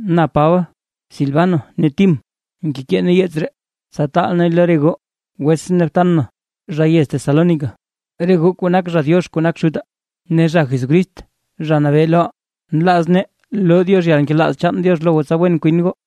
Na Paba, Silvano ne Tim, ngekee nee yeets ree tsa taal neey lo re goo wetsʼn ne btan na, zha yez Tesalónica, re goo kuu nak zha Diox kuu nak Xutaa ne zha Jesucrist Zha Nabee loʼaa. Nlaaz nee loo Diox yalnkelaaz Diox lo goo tsa wen kwin goo.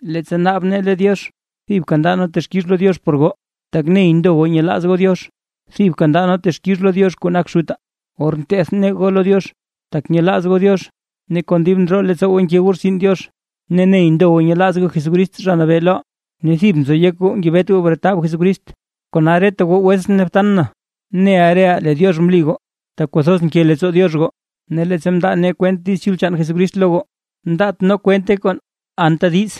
Leettsa naab nee lo Diox thibka ndaa nee texkix lo Diox por goo, tak ney ndo goo nyelaaz goo Diox. Thibka ndaa nee texkix lo Diox kuu nak Xutaa, or nteth nee goo lo Diox, tak nyelaaz goo Diox ne kon dib ndroo leettsoo goo nke goo rtsin Diox, ne ney ndo goo nyelaaz goo Jesucrist Zha Nabee loʼaa, ne thib nzo yek goo ngebet goo bretab Jesucrist. Kona reta goo wetsʼn ne btan na, neʼa reʼaa lee Diox mli goo tak kwathoz nke leettsoo Diox goo. Ne leettsa mndaa nee kwent Diiz Chul chaan Jesucrist lo goo, mndaat nee kwente kon anta diiz,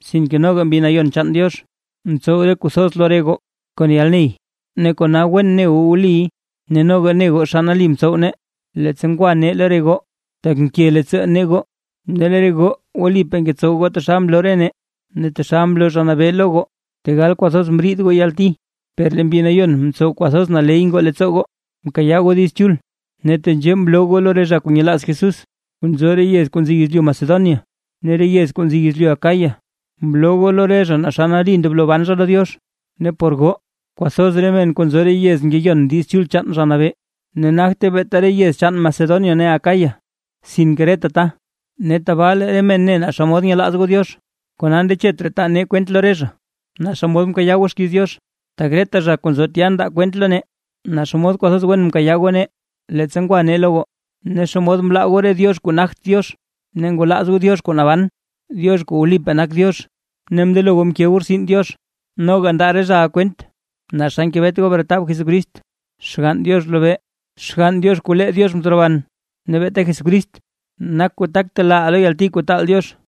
sinke noga Mbi Nayon chaan Diox mtsow re kuu thoz lo re goo kon yalney ne kona wen ne goo wliy. Ne noga ne goo naa xa nali mtsow nee, leettsa ngwa nee lo re goo, tak nke leettsoo nee goo. Ne lee re goo wlipaa ngetsow goo taxal mloo nee ne taxal mloo Zha Nabee lo goo. Tegal kwathoz mriid goo yalti, per lee Mbi Nayon mtsow kwathoz naley ngoo leettsoo goo mkayaa goo Diiz Chul. Ne tenzhee mloo goo lo re zha kuu nyelaaz Jesús kuu nzo re yez kuu nzi yezlyu Macedonia ne re yez kuu nzi yezlyu Acaya, mloo goo lo re zha naa xa nali ndoblo ban zha lo Diox. Ne por goo kwathoz men kuu nzo re yez ngeyon Diiz Chul chaan Zha Nabee, ne nagte beeta re yez chaan Macedonia ne Acaya sinke reta ta, ne tabaa lee re men ne naa xa nyelaaz goo Diox, kona ndechet raa taa nee kwent lo re zha, naa xomod mkayaa goo xkiiz Diox. Tak reta zha kuu nzo tya ndaa kwent lo nee naa xomod kwathoz wen mkayaa goo nee, leettsa ngwa nee lo goo, ne xomod mlaa goo re diox kuu nagt Diox ne ngwalaaz goo Diox kuu naban, Diox kuu wlipaa nak Diox ne mndelo goo mke goo rtsin Diox. Noga ndaa re zhaʼa kwent naa xa ngebet goo bretab Jesucrist Xgann Diox lobee, Xgann Diox kuu lee Diox mteroban. Ne beeta Jesucrist nak kuu tak telaaʼaa lo yalti kuu taal Diox.